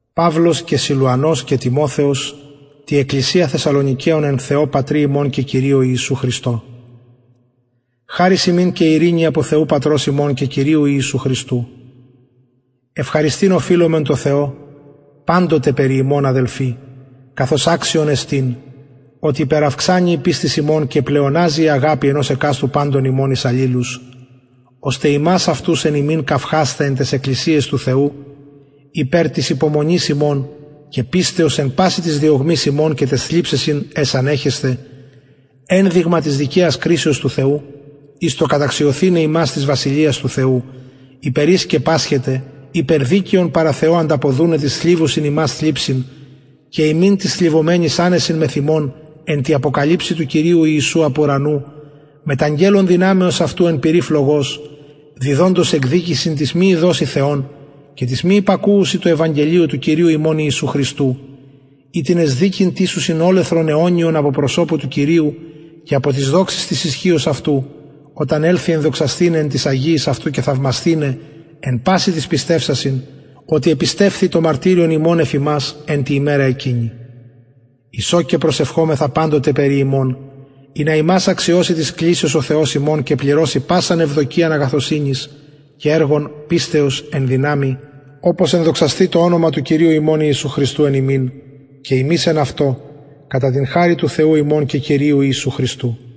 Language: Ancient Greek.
παυλος και σιλουανος και τιμοθεος τη εκκλησια θεσσαλονικεων εν θεω πατρι ημων και κυριω ιησου χριστω χαρις υμιν και ειρηνη απο θεου πατρος ημων και κυριου ιησου χριστου ευχαριστειν οφειλομεν τω θεω παντοτε περι υμων αδελφοι καθως αξιον εστιν οτι υπεραυξανει η πιστις υμων και πλεοναζει η αγαπη ενος εκαστου παντων υμων εις αλληλους ωστε ημας αυτους εν υμιν καυχασθαι εν ταις εκκλησιαις του θεου υπερ της υπομονης υμων και πιστεως εν πασιν τοις διωγμοις υμων και ταις θλιψεσιν αις ανεχεσθε ενδειγμα της δικαιας κρισεως του θεου εις το καταξιωθηναι υμας της βασιλειας του θεου υπερ ης και πασχετε ειπερ δικαιον παρα θεω ανταποδουναι τοις θλιβουσιν υμας θλιψιν και υμιν τοις θλιβομενοις ανεσιν μεθ ημων εν τη αποκαλυψει του κυριου ιησου απ ουρανου μετ αγγελων δυναμεως αυτου εν πυρι φλογος διδοντος εκδικησιν τοις μη ειδοσιν θεον και τοις μη υπακουουσιν τω ευαγγελιω του κυριου ημων ιησου οιτινες δικην τισουσιν ολεθρον αιωνιον απο προσωπου του κυριου και απο της δοξης της ισχυος αυτου οταν ελθη ενδοξασθηναι εν τοις αγιοις αυτου και θαυμασθηναι εν πασιν τοις πιστευσασιν οτι επιστευθη το μαρτυριον ημων εφ υμας εν τη ημερα εκεινη εις ο και προσευχομεθα παντοτε περι υμων ινα υμας αξιωση της κλησεως ο θεος ημων και πληρωση πασαν ευδοκιαν αγαθωσυνης και εργον πιστεως εν δυναμει οπως ενδοξασθη το ονομα του κυριου ημων ιησου εν υμιν και υμεις εν αυτω κατα την χαριν του θεου ημων και κυριου ιησου χριστου